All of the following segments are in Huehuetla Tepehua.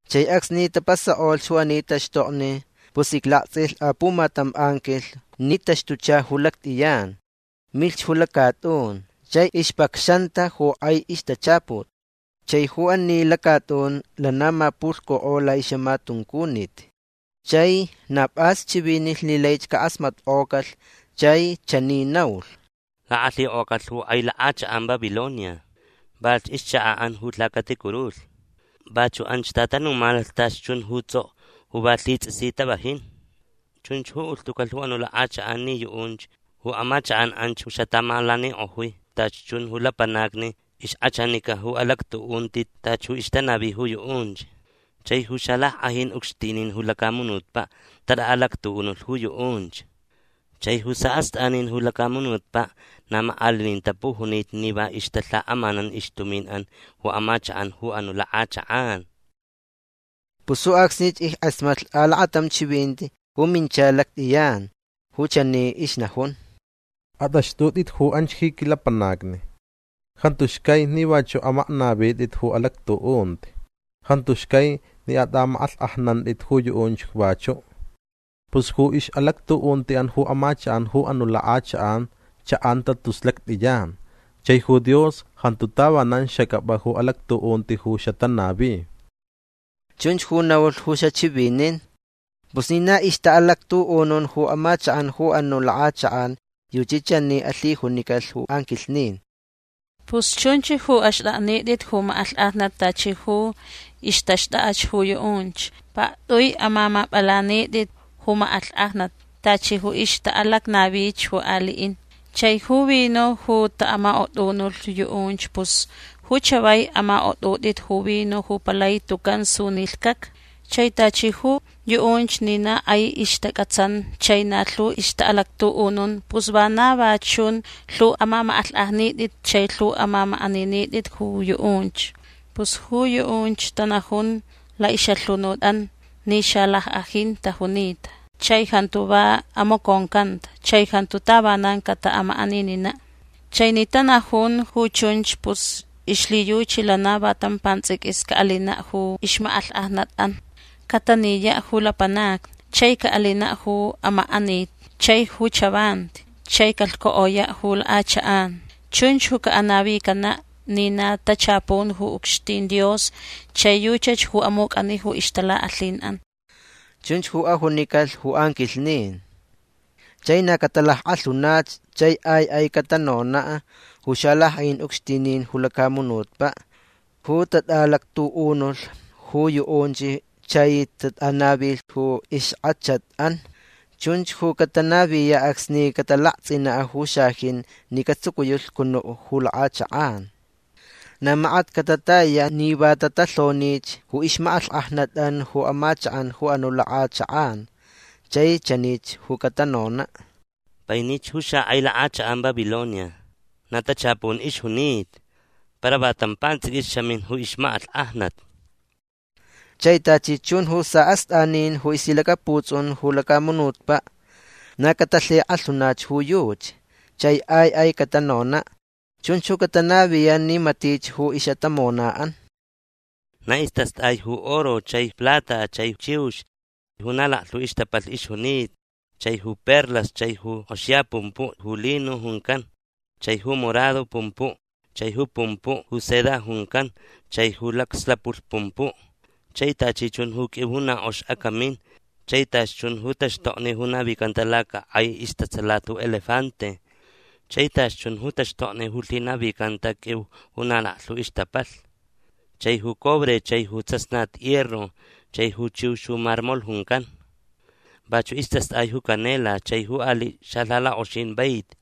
Chai acsni tapasakʼolh ju ani taxtokni pus iclaktsʼilh apumatam anquilh ni taxtucha ju lactʼiyan. Milhch ju lacatʼun. Chai ixpacxanta ju kʼai ixtachaput. Chai ju ani lacatʼun lana mapulhcukʼo laʼixʼamatuncunit. Chai na pʼas chivinilh ni laich cakʼasmatkʼocalh. Chai chani naulh: ―Lakʼalhikʼocalh ju kʼai lakʼachakʼan Babilonia. Valhch ixchakaʼan ju lhacaticurulhni. Vachuʼ anch tatanumanalh tachi chun ju tsʼokʼo ju va lhitsʼisi tavajin. Chunchach ju ulhtucalh ju anuʼ lakʼachakʼan ni yuʼunch ju amachakʼan anch ju xataʼamalanikʼojui tachi chun ju lapanacni ixkʼachanica ju alactuʼunti tachi ju ixtanavi ju yuʼunch. Chai ju xalackʼajin ucxtinin ju lacamunutpaʼ tatʼaʼalactuʼunulh ju yuʼunch. Chai ju saʼastʼanin ju lacamunutpaʼ na makʼalinin tapujunita ni va ixtalhakʼamanan ixtuminʼan ju amachakʼan ju anuʼ lakʼachakʼan. Pus ju acsnich ickʼasmatlh alakatam chivinti ju mincha lactʼiyan ju chani ixnajun: ―Atʼaxtʼutʼit ju anch ji quilapanacni. Jantu xcai ni vachuʼ amaknavitʼit ju alactuʼunti. Jantu xcai ni atʼamakʼalhkʼajnantʼit ju yuʼunch vachuʼ. Pus ju ixʼalactuʼuntiʼan ju amachakʼan ju anuʼ lakʼachakʼan chaʼanta tus lactʼiyan. Chai ju Dios jantu tavanan xacʼapʼa ju alactuʼunti ju xatanavi. ―Chunch ju naulh ju xachivinin. Pus ni na ixtaʼalactuʼunun ju amachakʼan ju anuʼ lakʼachakʼan yuchi chani alhijunicalh ju anquilhnin: ―Pus chunch ju axtʼaknitʼit ju makʼalhkʼajnat tachi ju ixtaxtʼakʼach ju yuʼunch. Paktʼui amamapʼalanitʼit ju makʼalhkʼajnat tachi ju ixtaʼalacnavich ju aliʼin. Chai ju vino ju taʼamakʼotʼunulh yuʼunch pus ju chavai amakʼotʼutʼit ju vino ju palai tucan sunilhcʼacʼa. Chai tachi ju yuʼunch ni na kʼai ixtacʼatsan chai na lhu ixtaʼalactuʼunun pus vana va chun lhu amamakʼalhkʼajnitʼit chai lhu amamakʼaninitʼit ju yuʼunch. Pus ju yuʼunch tanajun laʼixʼalhunutʼan ni xalackʼajin tajunita chai jantu va amaconcanta chai jantu tavanan cataʼamakʼanininaʼ. Chai ni tanajun ju chunch pus ixlhiyuchi lana va tam pantsʼiquis caʼalinaʼ ju ixmakʼalhkʼajnatʼan. Cataniyaʼ ju lapanacni. Chai caʼalinaʼ ju amakʼanit chai ju chavanti. Chai calhcukʼoyaʼ ju lakʼachakʼan. Chunch ju canavicanaʼ ni na tachapun ju ucxtin Dios. Chai yuchach ju amucʼani ju ixtalakʼalhinʼan. ―Chunch ju ajunicalh ju anquilhnin. Chai na catalackʼalhunach. Chai ai ai catanonaʼ ju xalackʼajin ucxtinin ju lacamunutpaʼ ju tatʼaʼalactuʼunulh ju yuʼunch chai tatʼanavilh ju ixkʼachatʼan. Chunch ju catanaviyaʼ acsni catalaktsʼinaʼ ju xajin ni catsucuyaʼ lhcunuʼ ju lakʼachakʼan. Na makat catatayayaʼ ni va tatalhonich ju ixmakʼalhkʼajnatʼan ju amachakʼan ju anuʼ lakʼachakʼan. Chai chanich ju catanonaʼ: ―Painich ju xakʼai lakʼachakʼan Babilonia. Na tachapun ixjunita. Para va tam pantsʼiquis xamin ju ixmakʼalhkʼajnat. Chai tachi chun ju saʼastʼanin ju ixlhilacaputsʼun ju lacamunutpaʼ na catalhikʼalhunach ju yuchi. Chai ai ai catanonaʼ. Chunch ju catanaviyaʼ ni matich ju ixʼatamonaʼan. Na istastʼai ju oro chai plata chai chiux ju na laklhu ixtapalh ixjunita chai ju perlas chai ju kʼoxiya pumpuʼ ju lino juncan chai ju morado pumpuʼ chai ju pumpuʼ ju seda juncan chai ju lakslapulh pumpuʼ chai tachi chun ju qʼuiu ju na kʼox acamin chai tachi chun ju taxtokni ju navicanta lacakʼai istatsalat ju elefante chai tachi chun ju taxtokni ju lhinavicanta qʼuiu ju na laklhu ixtapalh chai ju cobre chai ju tsasnat hierro chai ju chiux ju marmol juncan. Vachuʼ istastʼai ju canela chai ju aliʼ xalhalakʼoxin vaiti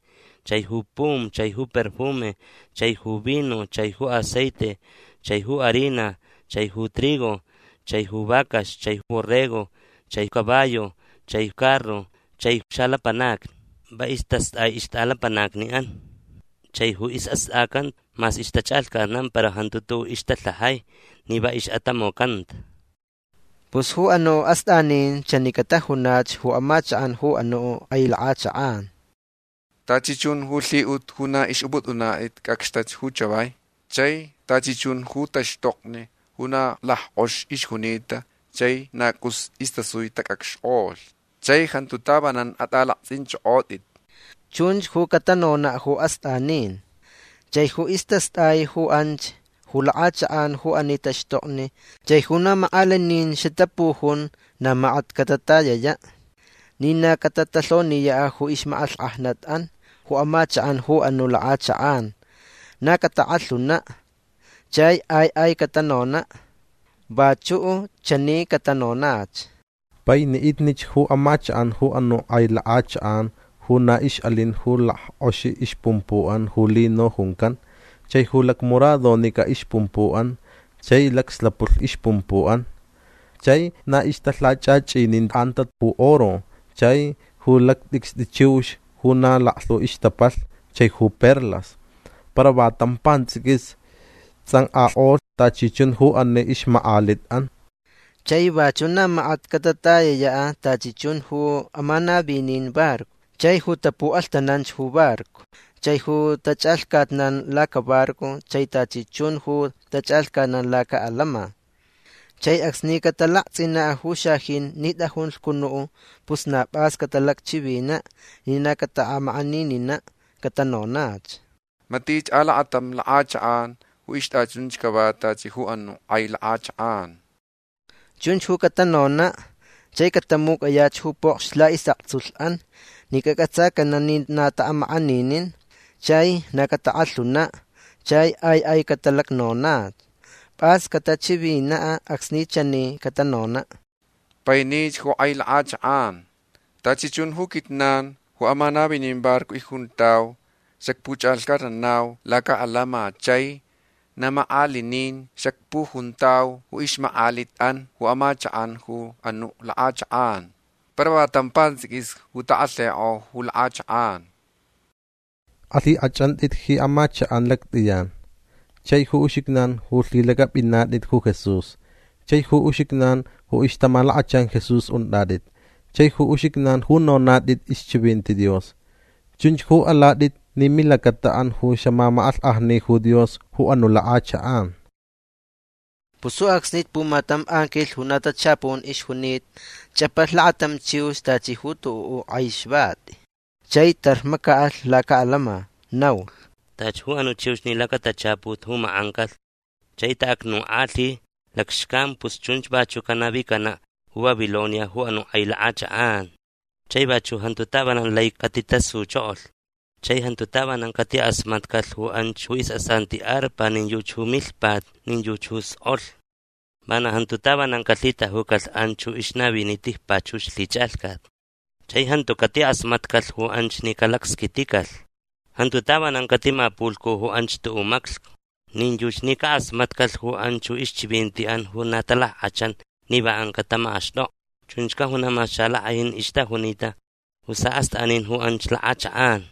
chai ju pum chai ju perfume chai ju vino chai ju aceite chai ju harina chai ju trigo chai ju vacax chai borrego chai caballo chai carro chai xalapanacni. Va istastʼai ixtʼalapanacniʼan. Chai ju isʼastʼacan mas ixtachʼalhcatnan para jantu tuʼuʼ ixtalhajai ni va ixʼatamocanta. Pus ju anuʼ astʼanin chani catajunach ju amachakʼan ju anuʼ kʼai lakʼachakʼan: ―Tachi chun ju lhiʼut ju na ixʼupʼutʼunatʼit cʼacxtach ju chavai. Chai tachi chun ju taxtokni ju na lackʼox ixjunita chai ju na cʼus istasui tacʼacxkʼolh. Chai jantu tavanan atʼalaktsʼinchʼokʼotʼit. ―Chunch ju catanonaʼ ju astʼanin. Chai ju istastʼai ju anch ju lakʼachakʼan ju ani taxtokni chai ju na makʼalinin xatapujun na makat catatayayaʼ ni na catatalhoniyaʼ ju ixmakʼalhkʼajnatʼan ju amachakʼan ju anuʼ lakʼachakʼan. Na catakʼalhunaʼ. Chai ai ai catanonaʼ. Vachuʼ chani catanonach: ―Painiʼitnich ju amachakʼan ju anuʼ kʼai lakʼachakʼan ju na ixʼalin ju lackʼoxi ixpumpuʼan ju lino juncan chai ju lacmoradonicʼa ixpumpuʼan chai lacslapulh ixpumpuʼan. Chai na ixtalhachʼachʼinincanta ju oro chai ju lacatʼicstʼi chiux ju na laklhu ixtapalh chai ju perlas. Para va tam pantsʼiquis tsʼankʼakʼolh tachi chun ju ani ixmakʼalitʼan. Chai vachuʼ na makat catatayayaʼ tachi chun ju amanavin barco chai ju tapuʼalhtananch ju barco chai ju tachʼalhcatnan lacabarco chai tachi chun ju tachʼalhcatnan lacaʼalama. Chai acsni catalaktsʼinaʼ ju xajin ni tʼajun lhcunuʼ pus na pʼas catalacchivinaʼ ni na cataʼamakʼanininaʼ. Catanonach: ―Matiʼ alakatam lakʼachakʼan ju ixtʼachunch cava tachi ju anuʼ kʼai lakʼachakʼan. ―Chunch ju catanonaʼ. Chai catamucʼayaʼ ju pokxni laʼisʼaktsulhʼan ni cacʼatsacanaʼ ni na taʼamakʼaninin. Chai na catalackʼalhunaʼ. Chai ai ai catalacnonaʼ. Pʼas catachivinaʼ acsni chani catanonaʼ: ―Painich ju kʼai lakʼachakʼan. Tachi chun ju quijnan ju amanavin barco icjuntau xacpuchʼalhcatnanau lacaʼalama chai na makʼalinin xacpujuntau ju ixmakʼalitʼan ju amachakʼan ju anuʼ lakʼachakʼan. Para va tam pantsʼiquis ju takʼalhikʼo ju lakʼachakʼan. Alhikʼachʼantʼit ji amachakʼan lactʼiyan chai ju uxijnan ju lhilacʼapʼinatʼit ju Jesús chai ju uxijnan ju ixtamalakachan Jesús untʼatʼit chai ju uxijnan ju nonatʼit ixchivinti Dios. Chunch ju alatʼit ni milacataʼan ju xamamakʼalhkʼajni ju Dios ju anuʼ lakʼachakʼan. Pus ju acsnich pumatam anquilh ju na tachapun ixjunita chʼapalh lakatam chiux tachi ju tuʼuʼ kʼai xvati. Chai tarr macaʼalh lacaʼalama. Naulh: ―Tachi ju anuʼ chiux ni lacatachaput ju makʼancalh chai taʼacnukʼalhi lacxcan pus chunch vachuʼ canavicanaʼ ju Babilonia ju anuʼ kʼai lakʼachakʼan. Chai vachuʼ jantu tavanan lai catitasuchokolh. Chai jantu tavanan catikʼasmatcalh ju anch ju isʼasanti arpa nin yuchi ju milhpat nin yuchi ju skʼolh. Vana jantu tavanan calhitajucalh anch ju ixnavini tijpachux lhichʼalhcat. Chai jantu catikʼasmatcalh ju anch ni calacsquiticalh. Jantu tavanan catimapulhcu ju anch tuʼuʼ maclhcu. Nin yuchi ni cakʼasmatcalh ju anch ju ixchivintiʼan ju na talackʼachan ni va ancaʼ tamakʼaxtʼokʼa. Chunch cajunaʼ mas xalackʼajin ixtajunita ju saʼastʼanin ju anch lakʼachakʼan.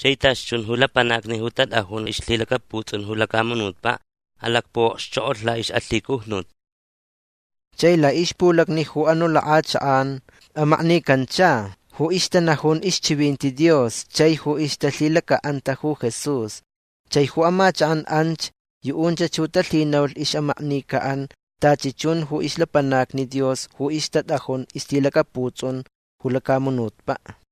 Chai tachi chun ju lapanacni ju tatʼajun ixlhilacaputsʼun ju lacamunutpaʼ alacpuʼokxchokʼolh laʼixʼalhicujnut. Chai laʼixpulacni ju anuʼ lakʼachakʼan amaknicancha ju ixtanajun ixchivinti Dios chai ju ixtalhilacaʼanta ju Jesús. Chai ju amachakʼan anch yuʼunch ju talhinaulh ixʼamaknicaʼan tachi chun ju ixlapanacni Dios ju ixtatʼajun ixlhilacaputsʼun ju lacamunutpaʼ.